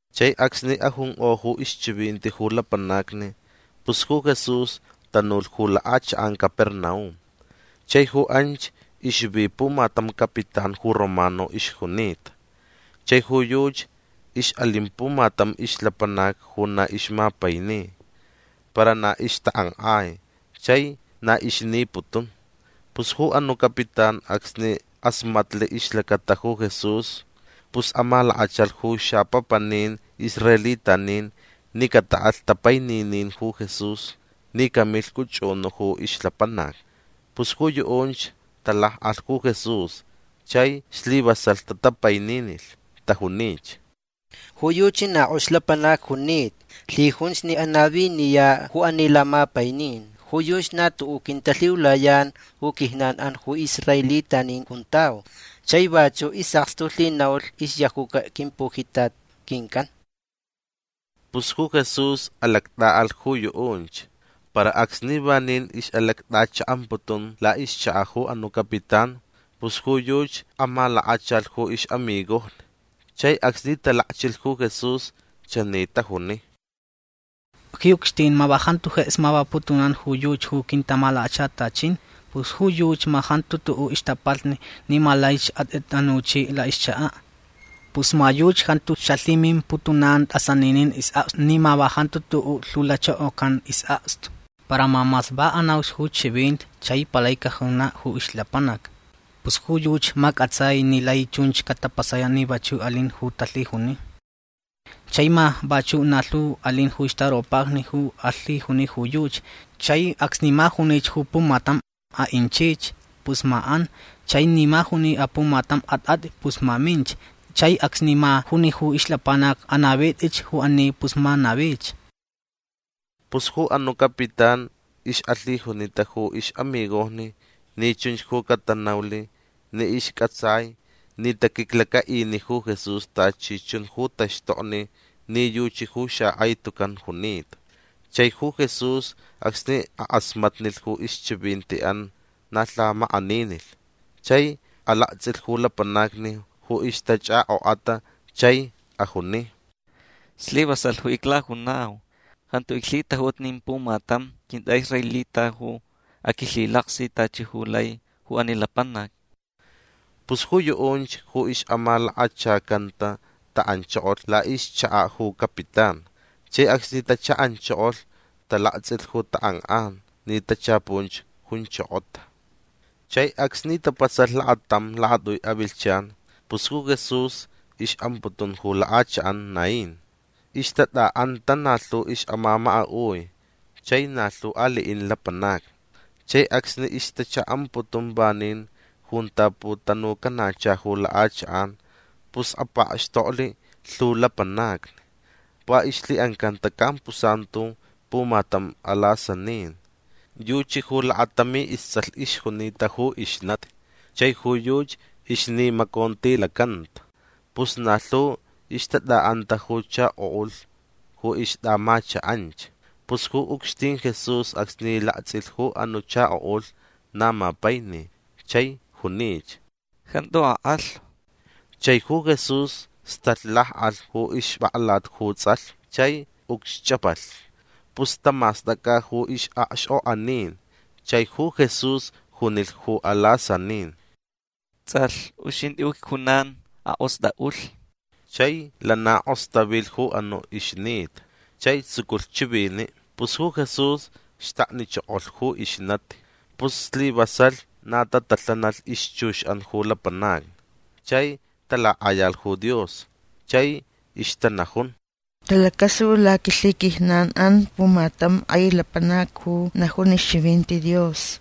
Chai acsni ajunkʼo ju ixchivinti ju lapanacni pus ju Jesús tanulh ju lakʼachakʼan Capernaum. Chai ju anch ixvi pumatam capitán ju romano ixjunita. Chai ju yuchi ixʼalin pumatam ixlapanac ju na ixmapaini. Para na ixtakʼankʼai chai na ixniputun. Pus ju anuʼ capitán acsni kʼasmatli ixlacata ju Jesús pus amalakachalh ju xapapanin israelitanin ni cataʼalh tapaininin ju Jesús ni camilh cʼuchʼunuʼ ju ixlapanac. Pus ju yuʼunch talakʼalh ju Jesús chai slivasalh tatapaininilh. Tajunich: ―Ju yuchi na kʼox lapanac junita. Lhijunch ni anaviniyaʼ ju ani lamapainin. Ju yuchi na tuʼuʼ quintalhiulayan ju quijnanʼan ju israelitanin juntau. Chai vachuʼ isʼakstu lhinaulh ixyajuca quimpujitat quincʼan. Pus ju Jesús alactʼaʼalh ju yuʼunch. Para acsni vanin ixʼalactʼachaʼamputun laʼixchakaʼ ju anuʼ capitán pus ju yuchi amalakachalh ju ixʼamigojni. Chai acsni talakchilh ju Jesús chani tajuni: ―Ji ucxtin ma va jantu jeks mavaputunan ju yuchi ju quintamalakachatachin. Pus ju yuchi ma jantu tuʼuʼ ixtapalhni ni ma laich atʼitʼanuchiʼ laʼixchakaʼ. Pus ma yuchi jantu xalhimimputunan tʼasaninin isʼakstu ni ma va jantu tuʼuʼ lhiulachokocan isʼakstu. Para ma mas va anauch ju chivinti chai palai cajunaʼ ju ixlapanac. Pus ju yuchi ma cʼatsai ni lai chunch catapasayaʼ ni vachuʼ alin ju talhijuni. Chai ma vachuʼ na lhu alin ju ixtaropajni ju alhijuni ju yuchi. Chai acsni ma junich ju pumatam: Aʼinchich. Pus ma an. Chai ni ma juni apumatam: Atʼatʼi. Pus ma minch. Chai acsni ma juni ju ixlapanac: Anavitʼich ju ani. Pus ma navich. Pus ju anuʼ capitán ixʼalhijunita ju ixʼamigojni ni chunch ju catanaulh ni iscʼatsai ni taquiclacaʼini ju Jesús tachi chun ju taxtokni ni yuchi ju xakʼai tucan junita. Chai ju Jesús acsni akʼasmatnilh ju ixchivintiʼan na lhamakʼaninilh. Chai alaktsʼilh ju lapanacni ju ixtachʼakʼokʼata chai ajuni: ―Slivasalh ju iclajunau. Jantu iclhitajuta nin pumatam quintʼaʼisraelita ju aquilhilaktsʼilh tachi ju lai ju ani lapanac. Pus ju yuʼunch ju ixʼamalakachacanta taʼanchokolh laʼixchakaʼ ju capitán. Chai acsni tachaʼanchokolh talaktsʼilh ju takʼankʼan ni tachapunch junchokota. Chai acsni tapasalh lakatam lakatʼui avilhchan pus ju Jesús ixʼamputun ju lakʼachakʼan Naín. Ixtatʼaʼanta na lhu ixʼamamakaʼui chai na lhu aliʼin lapanacni. Chai acsni ixchaʼamputun vanin junta putanucanacha ju lakʼachakʼan pus apakxtoklh lhu lapanacni. Va ixlhiʼancanta campusantu pumatam alasanin. Yuchi ju lakatami istsʼalh ixjunita ju ixnati chai ju yuchi ixnimacontilacanta. Pus na lhu ixtatʼaʼanta ju chakoʼulh ju ixtʼaʼamachakʼanch. Pus ju ucxtin Jesús acsni laktsʼilh ju anuʼ chakoʼulh na mapaini chai junich: ―Jantu akʼalhu. Chai ju Jesús stalh lakʼalh ju ixpʼaklat ju tsʼalh chai ucxchʼapalh. Pus tamastʼacʼa ju ixʼakxkʼokʼanin. Chai ju Jesús junilh ju alasanin: ―Tsʼalh uxintʼi ju icjunan. Akʼostʼaʼulh. Chai lana kʼostavilh ju anuʼ ixnita. Chai tsuculh chiviniʼ. Pus ju Jesús xtaknichokolh ju ixnati. Pus slivasalh na tatalhanalh ixchuxʼan ju lapanacni. Chai talakʼayalh ju Dios. Chai ixtanajun: ―Talacasulh laquilhiquijnanʼan pumatam kʼai lapanac ju najun ixchivinti Dios.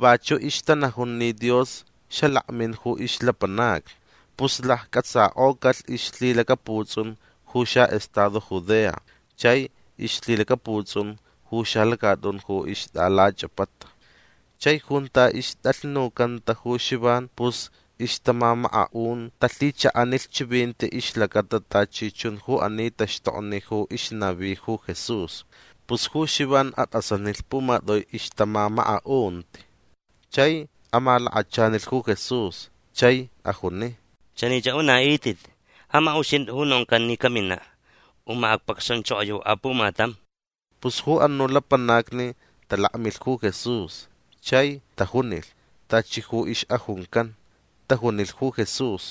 Vachuʼ ixtanajun ni Dios xalakmin ju ixlapanacni. Pus laccʼatsakʼocalh ixlhilacaputsʼun ju xaʼestado Judea chai ixlhilacaputsʼun ju xalacatʼun ju ixtʼalachʼapata. Chai junta ixtʼalhnucanta ju Xivan pus ixtamamakaʼun talhichaʼanilh chivinti ixlacata tachi chun ju ani taxtokni ju ixnavi ju Jesús. Pus ju Xivan atʼasanilh pumatʼui ixtamamakaʼunti. Chai amalakachanilh ju Jesús. Chai ajuni: ―Chanich aʼunaʼitʼit: Ja ma uxintʼi ju noncan ni caminaʼ. U ma acpacxanchokoyau apumatam. Pus ju anuʼ lapanacni talakmilh ju Jesús chai tajunilh tachi ju ixʼajuncan. Tajunilh ju Jesús: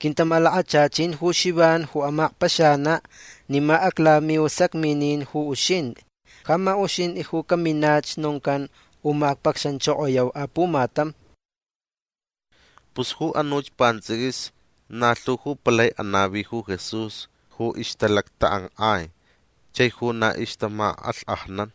―Quintamalakachachin ju Xivan ju amakpaxanaʼ ni ma aclamiu sacminin ju uxintʼi. Ja ma uxintʼi ju caminach noncan u ma acpacxanchokoyau apumatam. Pus ju anuch pantsʼiquis na lhu ju palai anavi ju Jesús ju ixtalactakʼankʼai chai ju na ixtamakʼalhkʼajnan.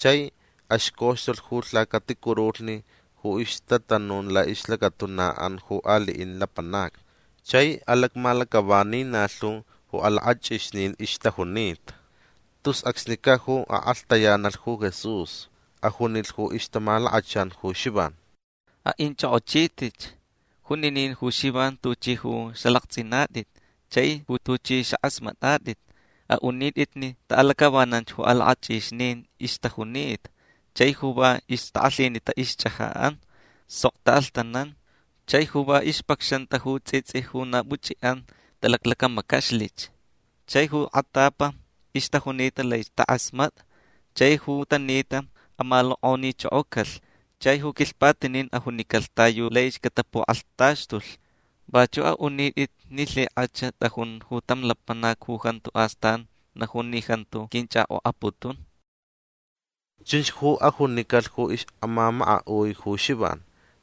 Chai axcoxtulh ju lhacaticurulhni ju ixtatanun laʼixlacatunaʼan ju aliʼin lapanacni. Chai alacmalacʼavani na lhu ju alakʼachʼixnin ixtajunita. Tus acsnicaʼ ju akʼalhtayanalh ju Jesús. Ajunilh ju ixtamalakachan ju Xivan: ―Aʼinchʼokʼochitʼitch juninin ju Xivan tuchʼi ju xalaktsʼinatʼit chai ju tuchʼi xakʼasmatʼatʼit. Aʼunaʼitʼit ni taʼalacʼavanan ju alakʼachʼixnin ixtajunita. Chai ju va ixtakʼalhinita ixchʼajaʼan sok taʼalhtanan. Chai ju va ixtapacxanta ju tsʼitsʼi ju na puchʼiʼan talaclacamacaxlich. Chai ju kʼatapa ixtajunita laich takʼasmatʼa. Chai ju tanita amalokʼonichokocalh. Chai ju quilhpatinin ajunicalh ta yu laich cataputakʼalhtaxtulh. Vachuʼ aʼunitʼit ni lhikʼach tʼajun ju tam lapanac ju jantu astan najun ni jantu quinchʼakʼokʼaputun. ―Chunch ju ajunicalh ju ixʼamamakaʼui ju Xivan.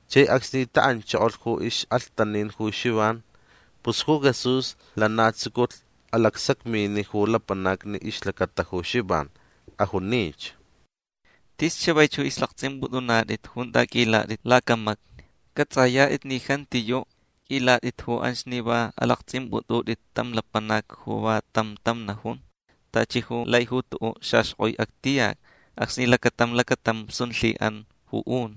Chai acsni taʼanchokolh ju ixʼalhtanin ju Xivan pus ju Jesús lana tsuculh alacsacminiʼ ju lapanacni ixlacata ju Xivan. Ajunich: ―Tis chavaich ju ixlaktsʼimpʼutʼunatʼit junta qʼuilatʼit lacamacni. Cʼatsʼayatʼit ni jantiyuʼ qʼuilatʼit ju anch ni va alaktsʼimpʼutʼutʼit tam lapanac ju va tam tam najun tachi ju lai ju tuʼuʼ xaxkʼoi actiyac acsni lacatam lacatam sun lhiʼan ju un.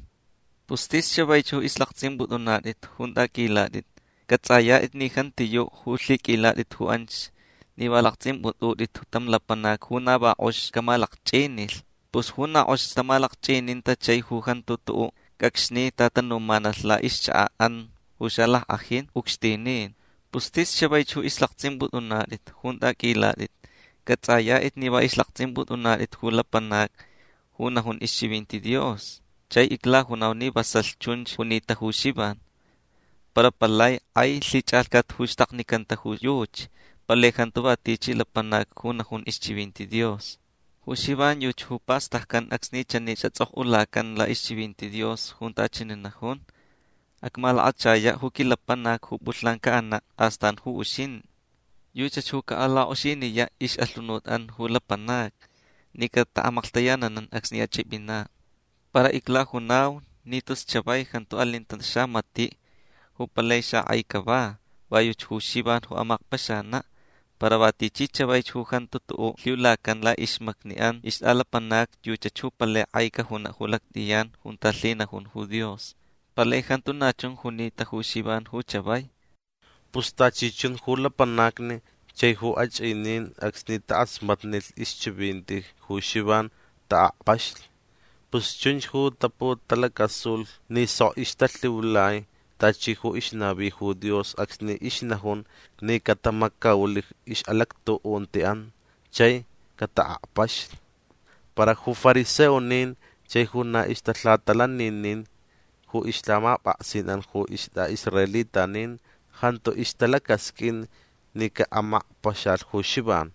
Pus tis chavaich ju ixlaktsʼimpʼutʼunatʼit junta qʼuilatʼit. Cʼatsʼayatʼit ni jantiyuʼ ju lhiqʼuilatʼit ju anch ni va alaktsʼimpʼutʼutʼit tam lapanac ju na va kʼox camalakchʼinilh. Pus ju na kʼox tamalakchʼininta chai ju jantu tuʼuʼ cʼacxni tatanumanalh laʼixchakaʼan ju xalackʼajin ucxtinin. Pus tis chavaich ju ixlaktsʼimpʼutʼunatʼit junta qʼuilatʼit. Cʼatsʼayatʼit ni va ixlaktsʼimpʼutʼunatʼit ju lapanac ju najun ixchivinti Dios. Chai iclajunau ni vasalh chunch junita ju Xivan. Para palai kʼai lhichʼalhcat ju xtaknicanta ju yuchi. Palai jantu va tichi lapanac ju najun ixchivinti Dios. Ju Xivan yuchi ju pastaccan acsni chani xatsʼokʼulacan laʼixchivinti Dios junta chani najun: Acmalakachayaʼ ju quilapanac ju pʼulhnan caʼanaʼ. Astan ju uxintʼi. Yuchach ju caʼalakʼoxiniyaʼ ixʼalhunutʼan ju lapanacni ni cataʼamaklhtayananan acsni achʼipʼinaʼ. Para iclajunau ni tus chavai jantu alinta tam xamatiʼ ju palai xakʼai cava. Va yuchi ju Xivan ju amakpaxanaʼ. Para va tichi chavaich ju jantu tuʼuʼ lhiulacan laʼixmacniʼan ixtʼalapanacni yuchach ju palai kʼai cajunaʼ ju lactʼiyan junta lhinajun ju Dios. Palai jantu na chun junita ju Xivan ju chavai. Pus tachi chun ju lapanacni chai ju achʼinin acsni takʼasmatnilh ixchivinti ju Xivan taʼakpaxlh. Pus chunch ju taputalacasulh ni sok ixtalhiulai tachi ju ixnavi ju Dios acsni ixnajun ni catamacaulh ixʼalactuʼuntiʼan chai cataʼakpaxlh. Para ju fariseonin chai ju na ixtalhatalaninin ju ixlhamapʼaksinʼan ju istʼaʼisraelitanin jantu ixtalacasqʼuin ni caʼamakpaxalh ju Xivan.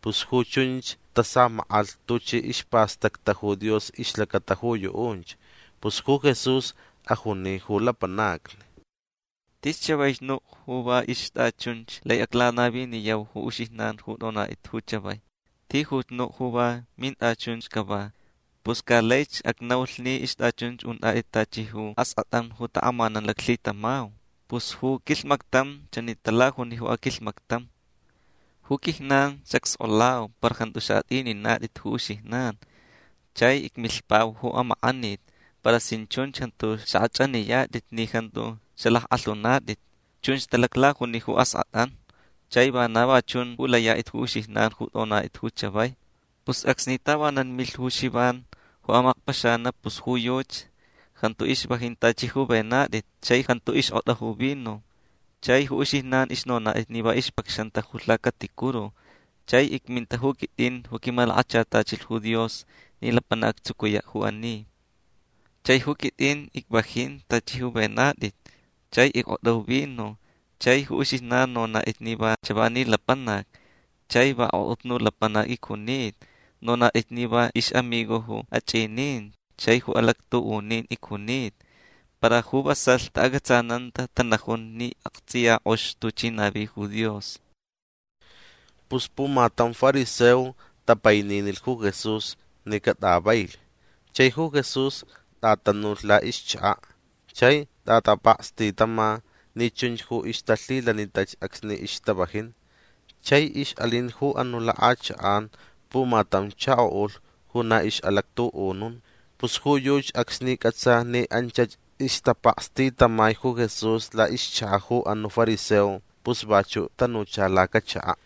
Pus ju chunch tasamakʼalh tuchi ispastacta ju Dios ixlacata ju yuʼunch. Pus ju Jesús ajuni ju lapanacni: ―Tis chavaich nuʼ ju va ixtʼachunch lai aclanaviniyau ju uxijnan ju tʼonatʼit ju chavai. Tijuch nuʼ ju va mintʼachunch cava. Pus ca laich acnaulh ni ixtʼachunch untʼatʼit tachi ju askʼatʼan ju takʼamanan laclhitamau. Pus ju quilhmactam chani talajuni ju aquilhmactam: “Ju quijnan xacskʼolau para jantu xaʼatʼininatʼit ju uxijnan. Chai icmilhpauch ju amakʼaniti para sin chunch jantu xakʼachʼaniyatʼit ni jantu xalackʼalhunatʼit”. Chunch talaclajuni ju askʼatʼan. Chai vana va chun ju layatʼit ju uxijnan ju tʼonatʼit ju chavai. Pus acsni tavanan milh ju Xivan ju amakpaxanaʼ pus ju yuchi jantu ixvajin tachi ju venatʼit chai jantu ixkʼotʼa ju vino. Chai ju uxijnan ixnonatʼit ni va ixpacxanta ju lhacaticuru. Chai icminta ju quitʼin ju quimalakachatachilh ju Dios ni lapanac actsucuyaʼ ju ani. Chai ju quitʼin icvajin tachi ju venatʼit chai ickʼotʼa ju vino chai ju uxijnan nonatʼit ni va chavani lapanac chai va akʼotnu lapanac icjunita. Nonatʼit ni va ixʼamigo ju achʼinin chai ju alactuʼunin icjunita. Para ju vasalh taʼacʼatsananta tanajun ni aktsʼiya kʼox tuchi navi ju Dios. Pus pumatam fariseo tapaininilh ju Jesús ni catʼavailh. Chai ju Jesús tʼatanulh laʼixchakaʼ chai tʼatapakstitama ni chunch ju ixtalhilanitach acsni ixtavajin. Chai ixʼalin ju anuʼ lakʼachakʼan pumatam chakoʼulh ju na ixʼalactuʼunun. Pus ju yuchi acsni cʼatsa ni anchach ixtapakstitamai ju Jesús laʼixchakaʼ ju anuʼ fariseo pus vachuʼ tanucha lacachakaʼ.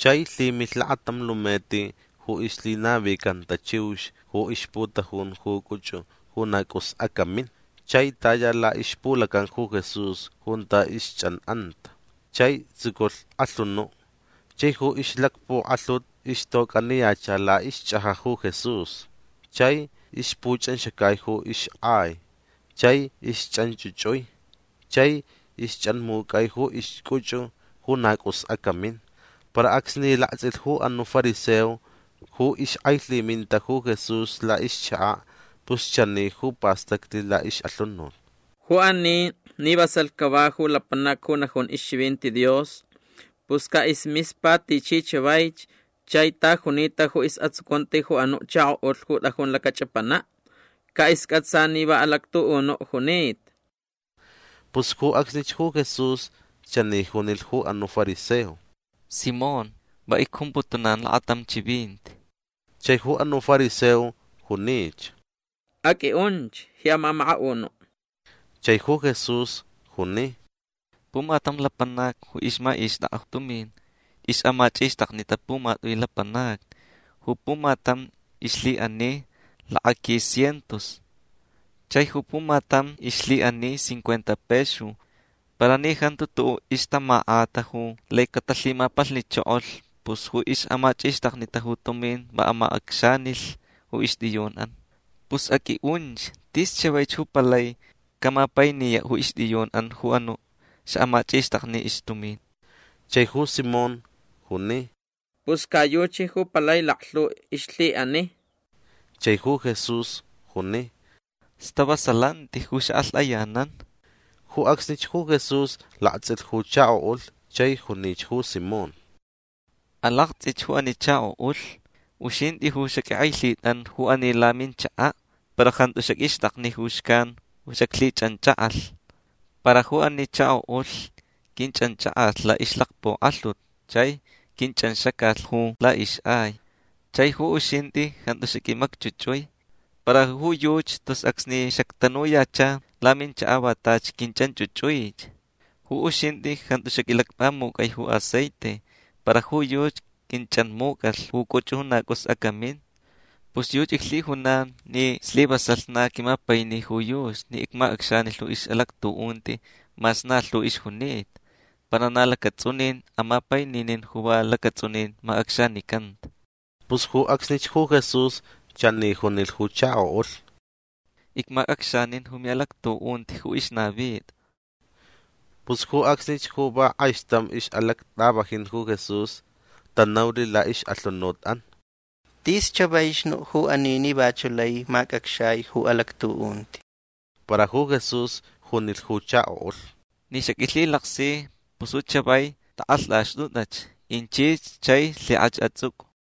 Chai lhimilh lakatam lumeti ju ixlhinavicanta chiux ju ixputajun ju cʼuchʼu ju na cʼus acamin. Chai taya laʼixpulacan ju Jesús junta ixchʼanʼanta. Chai tsuculh kʼalhunuʼ. Chai ju ixlakpukʼalhut ixtocʼaniyacha laʼixchʼajaʼ ju Jesús. Chai ixpuchʼanxacai ju ixʼai. Chai ixchʼanchʼuchʼui chai ixchʼanmucʼai ju ixcʼuchʼu ju na cʼus acamin. Para acsni laktsʼilh ju anuʼ fariseo ju ixkʼailhiminta ju Jesús laʼixchakaʼ pus chani ju pastaclh laʼixʼalhunut: “Ju ani ni vasalh cava ju lapanac ju najun ixchivinti Dios pus caʼismispa tichi chavaich chai ta junita ju isʼatsucunti ju anuʼ chakoʼulh ju tʼajun lacachʼapanaʼ. Caʼiscʼatsa ni va alactuʼunuʼ junita”. Pus ju acsnich ju Jesús chani junilh ju anuʼ fariseo: ―Simón va icjumputunan lakatam chivinti. Chai ju anuʼ fariseo junich: ―Aqʼuinʼunch ji amamakaʼunuʼ. Chai ju Jesús juni: ―Pumatam lapanac ju ixmachʼixtʼakʼa tumin ixʼamachʼixtaknita pumatʼui lapanacni. Ju pumatam ixlhiʼani lakaquis cientos. Chai ju pumatam ixlhiʼani cincuenta pexu. Para ni jantu tuʼuʼ ixtamakʼata ju lai catalhimapalhnichokolh pus ju ixʼamachʼixtaknita ju tumin va amacʼacxanilh ju ixtʼiyunʼan. Pus aqʼuinʼunch. Tis chavaich ju palai camapainiyaʼ ju ixtʼiyunʼan ju anuʼ xamachʼixtakni ixtumin. Chai ju Simón juni: ―Pus ca yuchi ju palai laklhu ixlhiʼani. Chai ju Jesús juni: ―Stavasalanti ju xakʼalhtʼayanan. Ju acsnich ju Jesús laktsʼilh ju chakoʼulh chai junich ju Simón: ―Alaktsʼich ju ani chakoʼulh. Uxintʼi ju xaqʼuinkʼailhitʼantʼa ju ani laminchakaʼ para jantu xaqʼuixtʼakni ju xcan ju xaclhichʼanchakʼalh. Para ju ani chakoʼulh quinchʼanchakʼalh laʼixlakpukʼalhut chai quinchʼanxacalh ju laʼixʼai. Chai ju uxintʼi jantu xaqʼuimacchʼuchʼui. Para ju yuchi tus acsni xactanuyacha laminchakaʼ va tachi quinchʼanchʼuchʼuich. Ju uxintʼi jantu xaqʼuilacpamucʼai ju aceite. Para ju yuchi quinchʼanmucʼalh ju cʼuchʼu ju na cʼus acamin. Pus yuchi iclhijunan ni slivasalh na quimapaini ju yuchi ni icmacʼacxanilh ju ixʼalactuʼunti mas na lhu ixjunita. Para na lacatsʼunin amapaininin ju va lacatsʼunin macʼacxanicanta. Pus ju acsnich ju Jesús chani junilh ju chakoʼulh: ―Icmacʼacxanin ju miʼalactuʼunti ju ixnavitʼa. Pus ju acsnich ju va kʼaixtam ixʼalactʼavajin ju Jesús tanaulh laʼixʼalhunutʼan: ―Tis chavaich nuʼ ju ani ni vachuʼ lai macʼacxai ju alactuʼunti. Para ju Jesús junilh ju chakoʼulh: ―Ni xaqʼuilhilaksi pus chavai tʼakʼalhtʼaxtʼutʼach. Inchich chai lhikʼach atsʼucʼu.